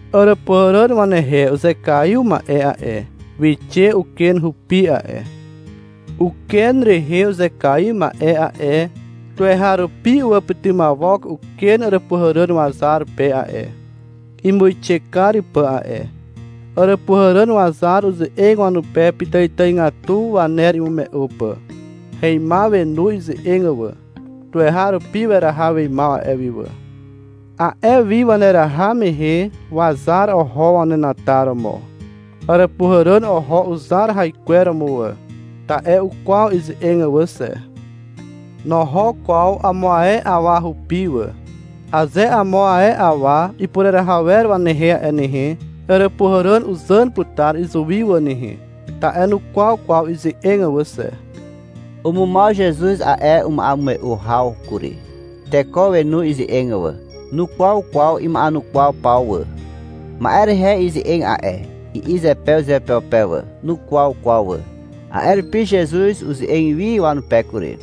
Àràpuhàràn wanehe uzekaiw ma'e a'e, wixe uken rupi a'e. Uken rehe uzekaiw ma'e a'e, tuweharupi uwàpytymawok uken àràpuhàràn wazar pe a'e, imuixe kar pà a'e. Àràpuhàràn wazar uze'eg wanupe pitàitàigatu waner imume'u pà. Heimaw wenu ize'eg wà. Tuweharupi weraha weimaw a'e wi wà. A'e wi waneraha mehe wazar oho wanenataromo. Àràpuhàràn oho uzar haikweromo wà, ta'e ukwaw ize'eg wà xe. Noho kwaw amo ae awa rupi wà. Aze amo ae awa ipureraha wer wanehe a'e nehe, àràpuhàràn uzàn putar izuwi wà nehe, ta'e nukwaw kwaw ize'eg wà xe. Umumaw Zezuz a'e ma'emume'u haw kury. Teko wenu ize'eg wà. Nukwaw kwaw ima'enukwaw paw wà. — Ma'e rehe ize'eg a'e, i'i zepe uzeupeupe wà. Nukwaw kwaw wà. A'e rupi Zezuz uze'eg wi wanupe kury.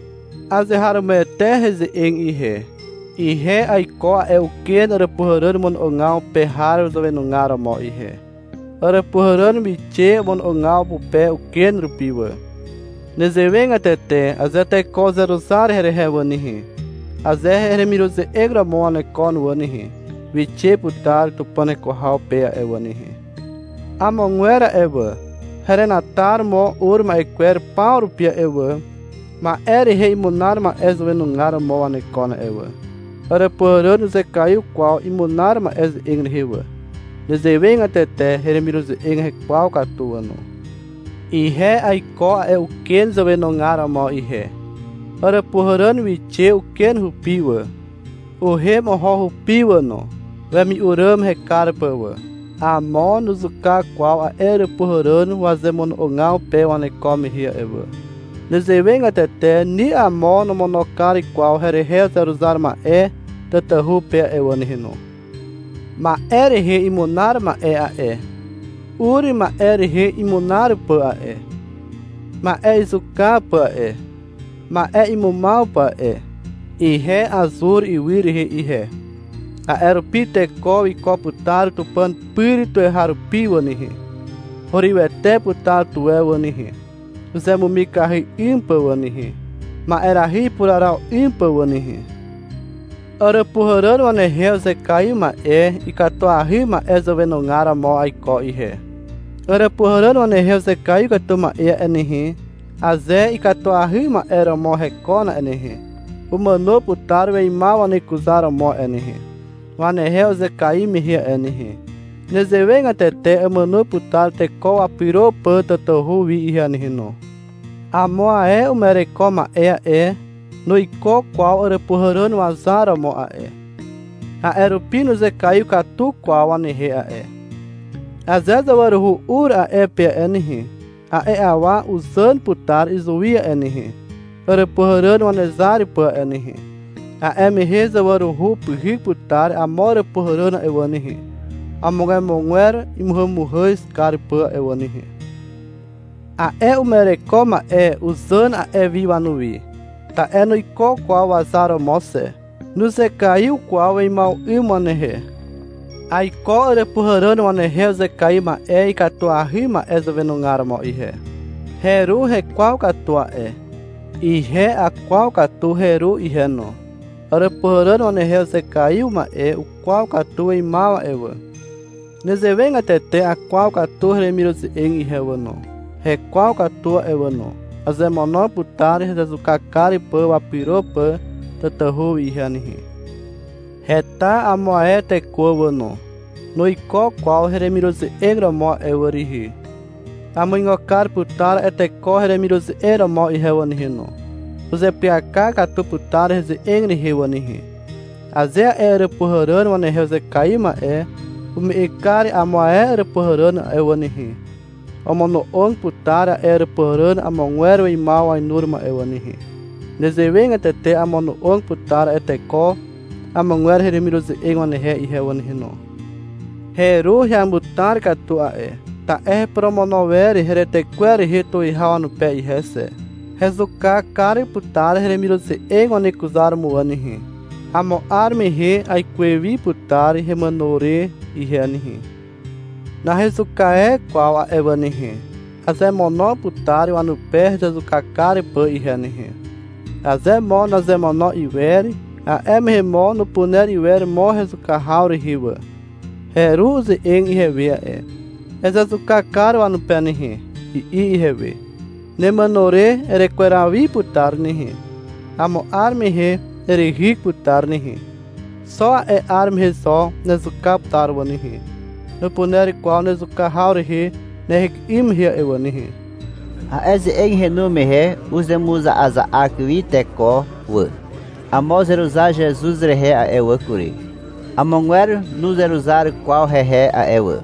— Azeharomoete heze'eg ihe. Ihe aiko a'e uken àràpuhàràn mono'ogaw pe har zàwenugar romo ihe. Àràpuhàràn wixe omono'ogaw pupe uken rupi wà. Nezewegatete aze teko uzeruzar herehe wà nehe, aze heremiruze'eg romo wanekon wà nehe, wixe putar Tupàn heko haw pe a'e wà nehe. Amogwer a'e wà, herenataromo ur ma'e kwer paw rupi a'e wà, ma'e rehe imunar ma'e zàwenugar romo wanekon a'e wà. Àràpuhàràn nuzekaiw kwaw imunar ma'e ze'eg rehe wà. Nezewegatete heremiruze'eg hekwaw katu wà no. Ihe aiko a'e uken zàwenugar romo ihe. Àràpuhàràn wixe uken rupi wà, uhem oho hupi wà no, wemi'u ràm hekar pà wà. Amo nuzuka kwaw a'e àràpuhàràn wazemono'ogaw pe waneko mehe a'e wà. Nezewegatete ni amo nomono kar kwaw herehe uzeruzar ma'e tatahu pe a'e wà nehe no. Ma'e rehe imunar ma'e a'e, ur ma'e rehe imunar pà a'e, ma'e izuka pà a'e, ma'e imumaw pà a'e. Ihe azur ywy rehe ihe, a'e rupi teko wiko putar Tupàn pyr tuweharupi a'e wà nehe. Hurywete putar tuwe wà nehe, uzemumikahy 'ym pà wà nehe, ma'erahy ipuraraw 'ym pà wà nehe. Àràpuhàràn wanehe uzekaiw ma'e ikatuahy ma'e zàwenugar romo aiko ihe. Àràpuhàràn wanehe uzekaiw katu ma'e a'e nehe, aze ikatuahy ma'e romo hekon a'e nehe, umàno putar weimaw wanekuzaromo a'e nehe, wanehe uzekaiw mehe a'e nehe. Nezewegatete amàno putar teko wapyro pà tatahu wi ihe nehe no. Amo ae uma'ereko ma'e a'e, nuiko kwaw àràpuhàràn wazar romo a'e, a'e rupi nuzekaiw katu kwaw wanehe a'e. Aze zawaruhu ur a'e pe a'e nehe, a'e awa uzàn putar izuwi a'e nehe, àràpuhàràn wanezar pà a'e nehe. A'e mehe zawaruhu upyhyk putar amo àràpuhàràn a'e wà nehe, omogwemogwer imuhàmuhàz kar pà a'e wà nehe. A'e uma'ereko ma'e uzàn a'e wi wanuwi, ta'e nuiko kwaw wazar romo xe. Nuzekaiw kwaw weimaw 'ym wanehe. Aiko àràpuhàràn wanehe uzekaiw ma'e ikatuahy ma'e zàwenugar romo ihe. Heru hekwaw katu a'e. Ihe akwaw katu heru ihe no. Àràpuhàràn wanehe uzekaiw ma'e ukwaw katu weimaw a'e wà. Nezewegatete akwaw katu heremiruze'eg ihe wà no. Hekwaw katu a'e wà no. Azemono putar hezezuka kar pà wapyro pà tatahu wi ihe nehe. Heta amo ae teko wà no, nuiko kwaw heremiruze'eg romo a'e wà rihi. Amuigo kar putar a'e teko heremiruze'eg romo ihe wà nehe no. Uzeapyaka katu putar heze'eg rehe wà nehe. Aze a'e àràpuhàràn wanehe uzekaiw ma'e ume'eg kar amo ae àràpuhàràn a'e wà nehe, omono'og putar a'e àràpuhàràn amogwer weimaw wainuromo a'e wà nehe. Nezewegatete amono'og putar a'e teko amogwer heremiruze'eg wanehe ihe wà nehe no. Heru heamutar katu a'e, ta'e heporomono wer heretekwer rehe tuwihaw wanupe ihe xe. Hezuka kar putar heremiruze'eg wanekuzaromo wà nehe. Amo 'ar mehe aikuwe wi putar hemàno re ihe nehe. Nahezuka e kwaw a'e wà nehe. Azemono putar wanupe hezezuka kar pà ihe nehe. Aze mo nazemono iwer, a'e mehe mo nupuner iwer mo hezuka haw rehe wà. Heru uze'eg ihewe a'e. — Ezezuka kar wanupe nehe, i'i ihewe. — Nemàno re erekweraw wi putar nehe. Amo 'ar mehe erehyk putar nehe. Xo a'e 'ar mehe zo nezuka putar a'e wà nehe. Nupuner kwaw nezuka haw rehe nehyk 'ym mehe a'e wà nehe. A'e ze'eg henu mehe uzemuza'aza'ak wi teko wà. Amo uzeruzar Zezuz rehe a'e wà kury. Amogwer nuzeruzar kwaw hehe a'e wà.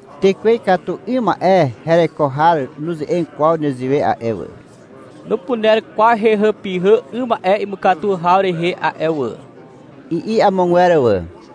— Tekwe ikatu 'ym ma'e hereko har nuze'eg kwaw nezewe a'e wà. Nupuner kwaw hehàpyhà 'ym ma'e imukatu haw rehe a'e wà, i'i amogwer wà.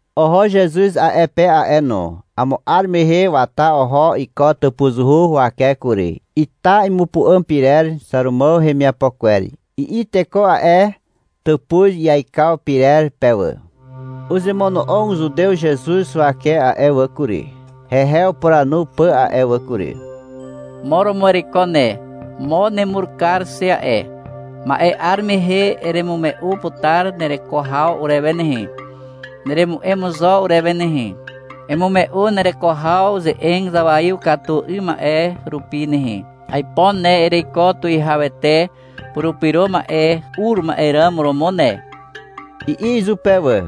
Oho Zezuz a'e pe a'e no. Amo 'ar mehe wata oho iko tàpuzuhu huwake kury. Ita imupu'àm pyrer Xàrumàw hemiapo kwer, i'i teko a'e tàpuz iaikaw pyrer pe wà. Uzemono'og Zutew Zezuz huwake a'e wà kury, hehe upuranu pà a'e wà kury. — Mo romo ereiko ne, mo nemur kar xe a'e. Ma'e 'ar mehe eremume'u putar nereko haw urewe nehe. Neremu'em zo urewe nehe. Emume'u nereko haw ze'eg zawaiw katu 'ym ma'e rupi nehe. Aipo ne ereiko Tuwihawete Purupyro Ma'e ur ma'e ràm romo ne, i'i izupe wà.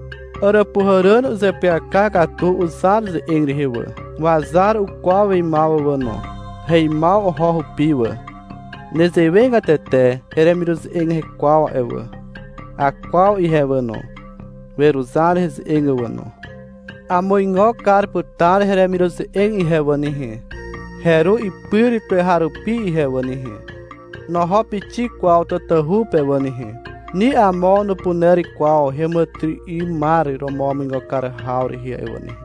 Àràpuhàràn uzeapyaka katu uzar ze'eg rehe wà. Wazar ukwaw weimaw wà no. Heimaw oho hupi wà. Nezewegatete heremiruze'eg hekwaw a'e wà. Akwaw ihe wà no. Weruzar heze'eg wà no. Amuigo kar putar heremiruze'eg ihe wà nehe, heru ipyr tuweharupi ihe wà nehe. Noho pixik kwaw tatahu pe wà nehe. Ni amo nupuner kwaw heàmàtyry'ymar romo wamuigo kar haw rehe a'e wà nehe.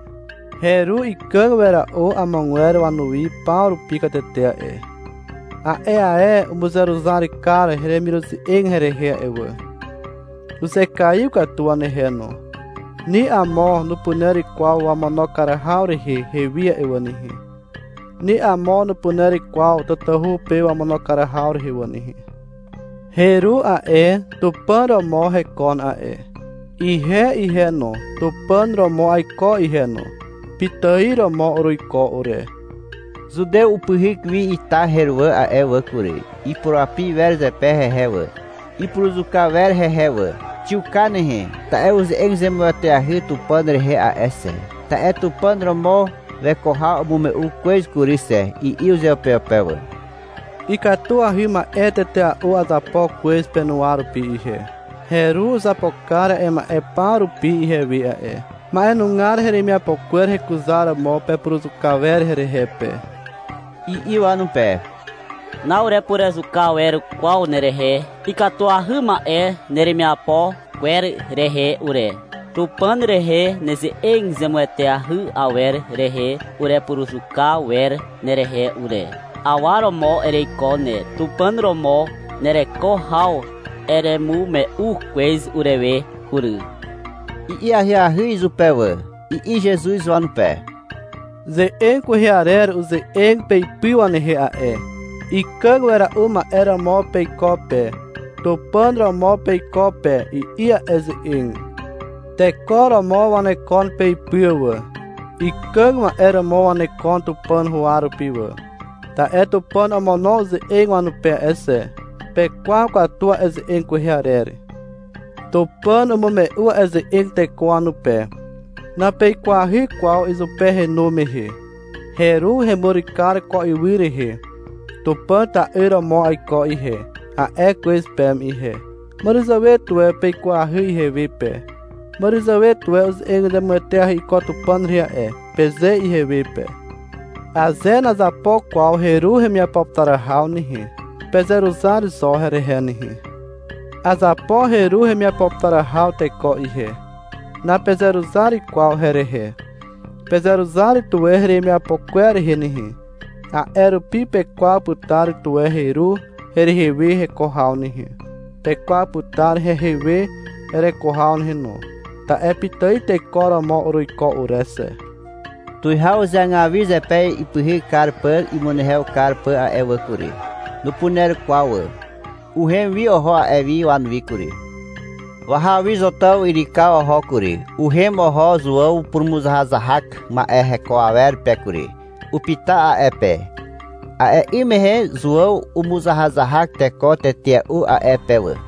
Heru ikàg wera'u amogwer wanuwi paw rupi katete a'e. A'e ae umuzeruzar kar heremiruze'eg herehe a'e wà. Uzekaiw katu wanehe no. Ni amo nupuner kwaw wamono kar haw rehe hewi a'e wà nehe. Ni amo nupuner kwaw tatahu pe wamono kar haw rehe wà nehe. Heru a'e, Tupàn romo hekon a'e. Ihe ihe no, Tupàn romo aiko ihe no. Pitài romo uruiko ure. Zutew upyhyk wi ita heruwà a'e wà kury. Ipurapi wer zepe hehe wà. Ipuruzuka wer hehe wà. — Xiuka nehe, ta'e uze'eg zemueteahy Tupàn rehe a'e xe, ta'e Tupàn romo weko haw umume'u kwez kury xe, i'i uzeupeupe wà. — Ikatuahy ma'e tetea'u azapo kwez penuwa rupi ihe. Heru uzapo kar a'e ma'e paw rupi ihewe a'e. Ma'enugar heremiapo kwer hekuzaromo pepuruzuka wer herehe pe, i'i wanupe. — Na'urepuruzuka wer kwaw nerehe ikatuahy ma'e neremiapo kwer rehe ure. Tupàn rehe neze'eg zemueteahy awer rehe urepuruzuka wer nerehe ure. Awa romo ereiko ne. Tupàn romo nereko haw eremume'u kwez urewe kury, i'i ahyahy izupe wà. I'i Zezuz wanupe. — Ze'eg kwehe arer uze'eg peipy wanehe a'e. — Ikàg wera'u ma'e romo peiko pe, Tupàn romo peiko pe, i'i a'e ze'eg. Teko romo wanekon peipy wà. Ikàg ma'e romo wanekon Tupàn huwa rupi wà, ta'e Tupàn omono uze'eg wanupe a'e xe. Pekwaw katu a'e ze'eg kwehe arer. — Tupàn umume'u a'e ze'eg teko wanupe. Napeikwahy kwaw izupe henu mehe. Heru hemur kar ko ywy rehe. — Tupàn ta'yr romo aiko ihe, a'e kwez peme ihe. Màràzàwe tuwe peikwahy ihewe pe. Màràzàwe tuwe — Uze'eg zemueteahy iko Tupàn rehe a'e, peze ihewe pe. — Aze nazapo kwaw heru hemiapo putar haw nehe, pezeruzar zo herehe nehe. Azapo heru hemiapo putar haw teko ihe. Napezeruzar kwaw herehe. Pezeruzar tuwe heremiapo kwer rehe nehe. A'e rupi pekwaw putar tuwe heru herehe we heko haw nehe, pekwaw putar hehe we hereko haw nehe no, ta'e pitài teko romo uruiko ure xe. Tuwihaw uzeagaw wi zepe ipyhyk kar pà imunehew kar pà a'e wà kury. Nupuner kwaw wà. Uhem wi oho a'e wi wanuwi kury. Wahaw wi Zotàw yrykaw oho kury. Uhem oho Zuàw purumuzahazahak ma'e heko awer pe kury. Upyta a'e pe. (A'e 'ym mehe Zuàw umuzahazahak teko tetea'u a'e pe wà.)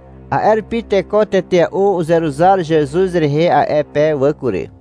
A'e rupi teko tetea'u uzeruzar Zezuz rehe a'e pe wà kury.